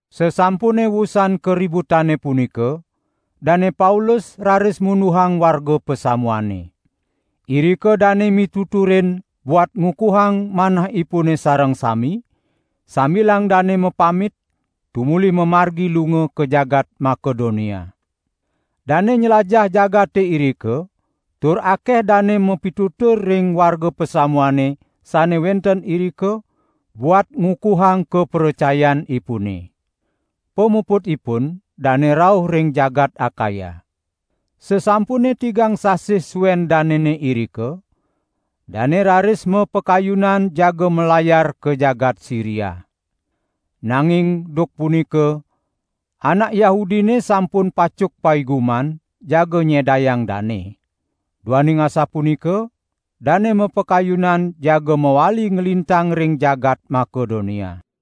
Sasampune wusan kaributane punika, Dane Paulus raris munduhang warga pasamuane. Irika dane mituturin buat ngukuhang manahipune sareng sami, sambilang dane mapamit, tumuli mamargi lunga ka jagat Makedonia. Dane nylajah jagate irika tur akeh dane mapitutur ring warga pasamuane sane wenten irika buat ngukuhang kapracayanipune. Pamuputipun dane rauh ring jagat Akaya. Sasampune tigang sasih suen danene irika, dane raris mapakayunan jaga malayar ka jagat Siria. Nanging duk punika anak Yahudine sampun pacuk paiguman jaga nyedayang dane. Duaning asapunika dane mapakayunan jaga mawali nglintang ring jagat Makedonia.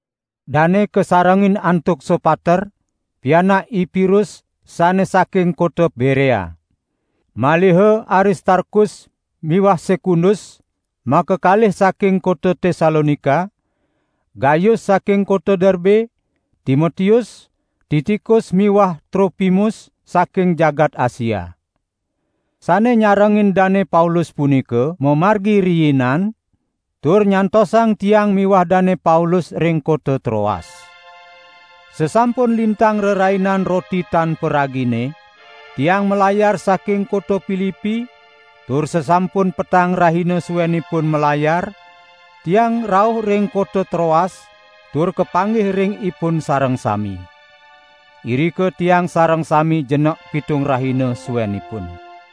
Dane kasarengin antuk Sopater, pianak I Pirus sane saking kota Berea. Maliha Aristarkus miwah Sekundus, makakalih saking kota Tesalonika, Gayus saking kota Derbe, Timotius, Tikikus miwah Tropimus saking jagat Asia. Sane nyarengin Dane Paulus punika mamargi riinan tur nyantosang tiang miwah Dane Paulus ring kota Troas. Sasampun lintang Rerainan Roti Tan Paragine, tiang malayar saking kota Pilipi, tur sasampun petang rahina suenipun malayar, tiang rauh ring kota Troas tur kapanggih ring ipun sareng sami. Irika tiang sareng sami jenek pitung rahina suenipun.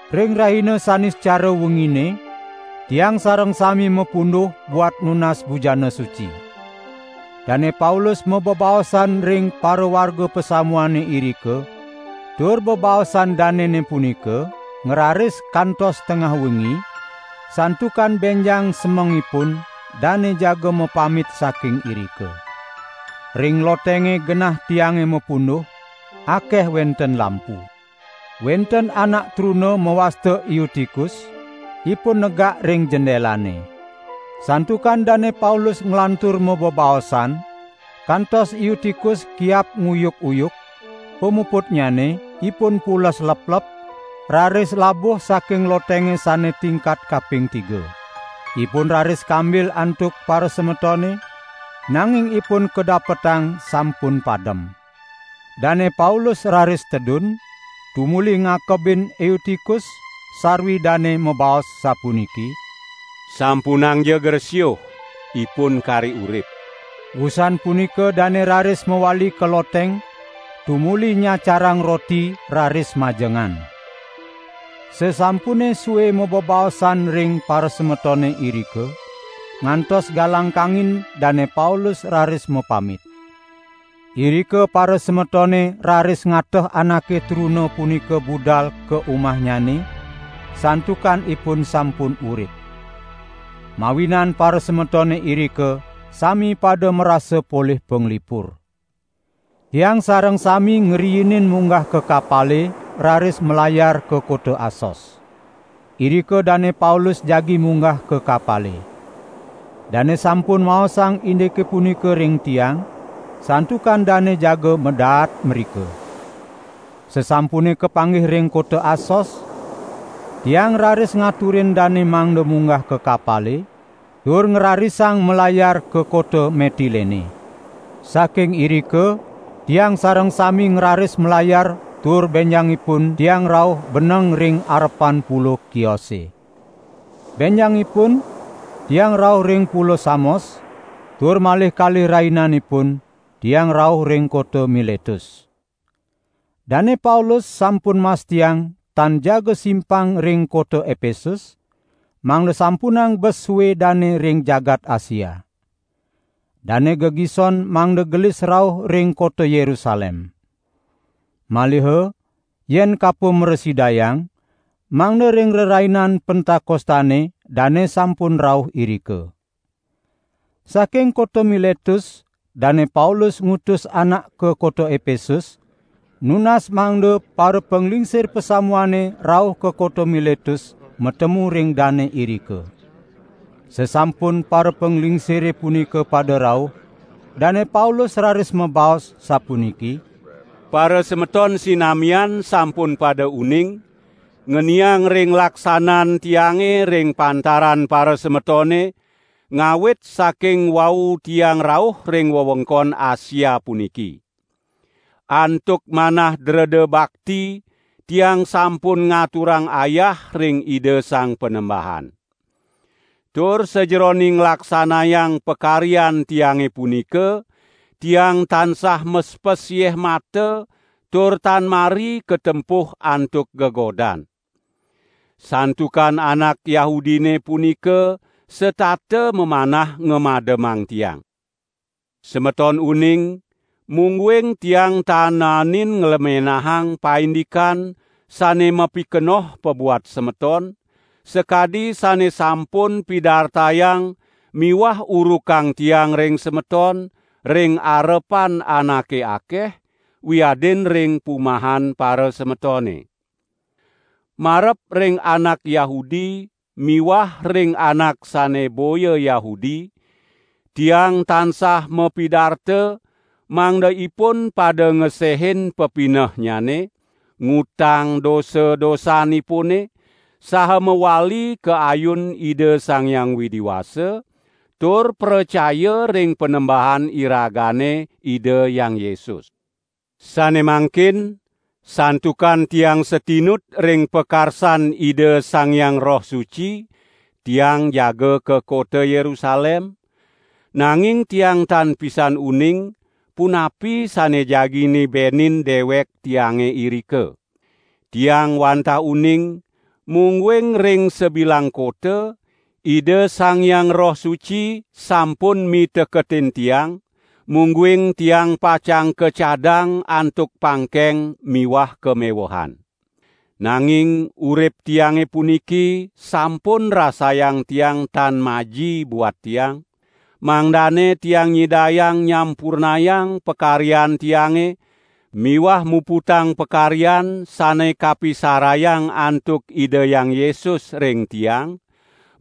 Ring rahina Saniscara wengine, tiang sareng sami mapunduh buat nunas bujana suci. Dane Paulus mabebaosan ring parawarga pasamuane irika, tur bebaosan danene punika ngraris kantos tengah wengi, santukan benjang semengipun dane jaga mapamit saking irika. Ring lotenge genah tiange mapunduh, akeh wenten lampu. Wenten anak truna mawasta Eutikus, ipun negak ring jendelane. Santukan Dane Paulus nglantur mabebaosan, kantos Eutikus kiap nguyuk-uyuk, pamuputnyane ipun pules leplep, raris labuh saking lotenge sane tingkat kaping tiga. Ipun raris kambil antuk parasemetone, nanging ipun kadapetang sampun padem. Dane Paulus raris tedun, tumuli ngakebin Eutikus, sarwi dane mabaos sapuniki: "Sampunangja gresiuh, ipun kari urip." Wusan punika dane raris mawali ka loteng, tumuli nyacarang roti raris majengan. Sasampune sue mabebaosan ring parasemetone irika, ngantos galang kangin Dane Paulus raris mapamit. Irika parasemetone raris ngateh anake truna punika budal ka umahnyane santukan ipun sampun urip. Mawinan parasemetone irika sami pada marasa polih panglipur. Tiang sareng sami ngriinin munggah ka kapale raris malayar ka kota Asos. Irika Dane Paulus jagi munggah ka kapale. Dane sampun maosang indike punika ring tiang, santukan dane jaga madaat mrika. Sasampune kapanggih ring kota Asos, tiang raris ngaturin dane mangda munggah ka kapale, tur ngrarisang malayar ka kota Metilene. Saking irika tiang sareng sami ngraris malayar tur benjangipun tiang rauh beneng ring arepan Pulo Kiose. Benjangipun tiang rauh ring Pulo Samos, tur malih kalih rahinanipun tiang rauh ring kota Miletus. Dane Paulus sampun mastiang tan jaga simpang ring kota Epesus, mangda sampunang bes sue dane ring jagat Asia. Dane gegison mangda gelis rauh ring kota Yerusalem. Maliha yen kapo mrasidayang mangda ring Rerainan Pentakostane dane sampun rauh irika. Saking kota Miletus Dane Paulus ngutus anak ka kota Epesus, nunas mangda parapanglingsir pasamuane rauh ka kota Miletus matemu ring dane irika. Sasampun parapanglingsire punika pada rauh, Dane Paulus raris mabaos, sapuniki: "Parasemeton sinamian sampun pada uning, ngeniang ring laksanan tiange ring pantaran parasemetone, ngawit saking wau tiang rauh ring wewengkon Asia puniki. Antuk manah dreda bakti tiang sampun ngaturang ayah ring Ida Sang Panembahan. Tur sajeroning nglaksanayang pakaryan tiange punika, tiang tansah mespes yeh mata tur tan mari katempuh antuk gegodan. Santukan anak Yahudine punika setata mamanah ngamademang tiang. Semeton uning, mungguing tiang tan naenin nglemenahang paindikan sane mapikenoh pabuat semeton, sakadi sane sampun pidartayang miwah urukang tiang ring semeton ring arepan anake akeh, wiadin ring pumahan parasemetone. Marep ring anak Yahudi miwah ring anak sane boya Yahudi tiang tansah mapidarta mangda ipun pada ngesehin pepinehnyane, ngutang dosa-dosanipune, saha mawali ka ayun Ida Sang Hyang Widi Wasa, tur pracaya ring Panembahan iragane Ida Hyang Yesus. Sane mangkin, santukan tiang satinut ring pakarsan Ida Sang Hyang Roh Suci, tiang jaga ka kota Yerusalem, nanging tiang tan pisan uning, punapi sane jagi nibenin dewek tiange irika. Tiang wantah uning, mungguing ring sabilang kota, Ida Sang Hyang Roh Suci sampun miteketin tiang, mungguing tiang pacang kacadang antuk pangkeng miwah kamewehan. Nanging urip tiange puniki sampun rasayang tiang tan maji buat tiang, mangdane tiang nyidayang nyampurnayang pakaryan tiange miwah muputang pakaryan sane kapirasayang antuk Ida Hyang Yesus ring tiang,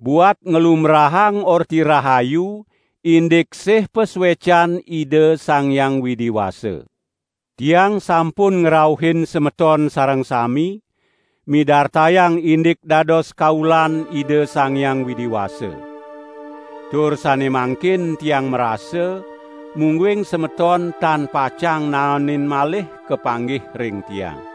buat nglumbrahang Orti Rahayu indik sih pasuecan Ida Sang Hyang Widi Wasa. Tiang sampun ngrauhin semeton sareng sami, midartayang indik dados kaulan Ida Sang Hyang Widi Wasa. Tur sane mangkin tiang marasa, mungguing semeton tan pacang naenin malih kapanggih ring tiang.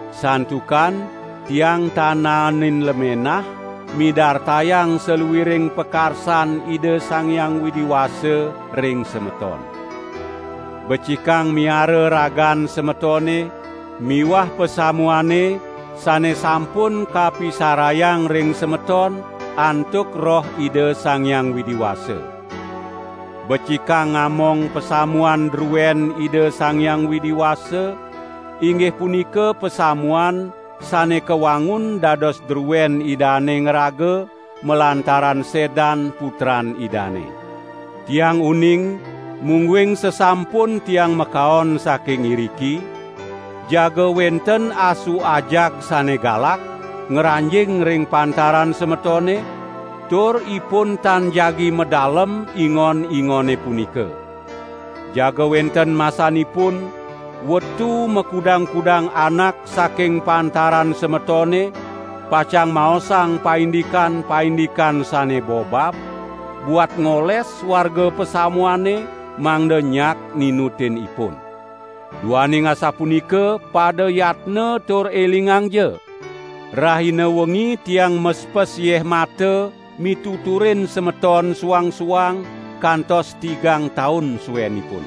Santukan tiang tan naenin lemenah midartayang saluiring pakarsan Ida Sang Hyang Widi Wasa ring semeton. Becikang miara ragan semetone miwah pasamuane sane sampun kapisarayang ring semeton antuk Roh Ida Sang Hyang Widi Wasa. Becikang ngamong pasamuan druen Ida Sang Hyang Widi Wasa, inggih punika pasamuan sane kawangun dados druen Idane ngraga malantaran sedan Putran Idane. Tiang uning, mungguing sasampun tiang makaon saking iriki, jaga wenten asu ajag sane galak ngranjing ring pantaran semetone, tur ipun tan jagi madalem ingon-ingone punika. Jaga wenten masanipun, wetu makudang-kudang anak saking pantaran semetone pacang maosang paindikan-paindikan sane bobab, buat ngoles warga pasamuane mangda nyak ninutin ipun. Duaning asapunika pada yatna tur elingangja, rahina wengi tiang mespes yeh mata mituturin semeton suang-suang kantos tigang taun suenipun.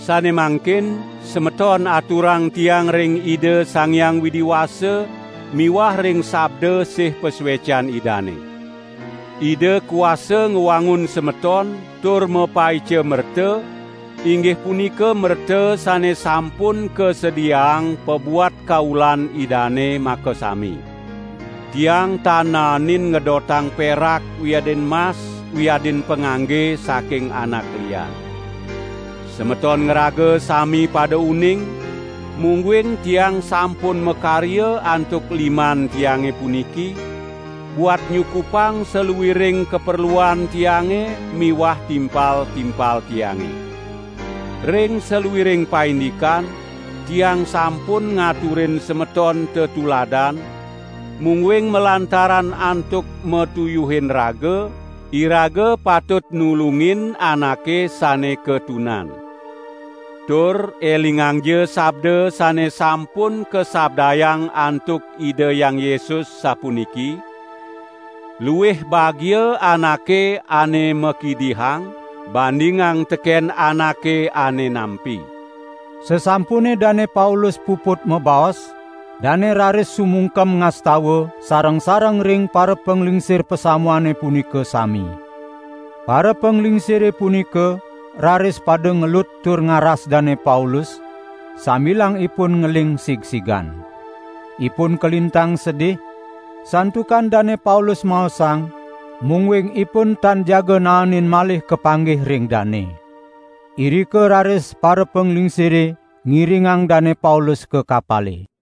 Sane mangkin semeton aturang tiang ring Ida Sang Hyang Widi Wasa miwah ring sabda sih pasuecan Idane. Ida kuasa ngwangun semeton tur mapaica merta, inggih punika merta sane sampun kasediaang pabuat kaulan Idane makasami. Tiang tan naenin ngedotang perak wiadin mas wiadin pangangge saking anak lian. Semeton ngraga sami pada uning, mungguing tiang sampun makarya antuk liman tiange puniki, buat nyukupang saluiring kaperluan tiange miwah timpal-timpal tiange. Ring saluiring paindikan, tiang sampun ngaturin semeton tetuladan, mungguing malantaran antuk matuyuhin raga, iraga patut nulungin anake sane katunan. Tur elingangja sabda sane sampun kasabdayang antuk Ida Hyang Yesus sapuniki: 'Luih bagia anake ane makidihang bandingang teken anake ane nampi.' " Sasampune Dane Paulus puput mabaos, dane raris sumungkem ngastawa sareng-sareng ring parapanglingsir pasamuane punika sami. Parapanglingsire punika raris pada ngelut tur ngaras Dane Paulus, sambilang ipun ngeling sigsigan. Ipun kalintang sedih santukan Dane Paulus maosang, mungguing ipun tan jaga naenin malih kapanggih ring dane. Irika raris parapanglingsire ngiringang Dane Paulus ka kapale.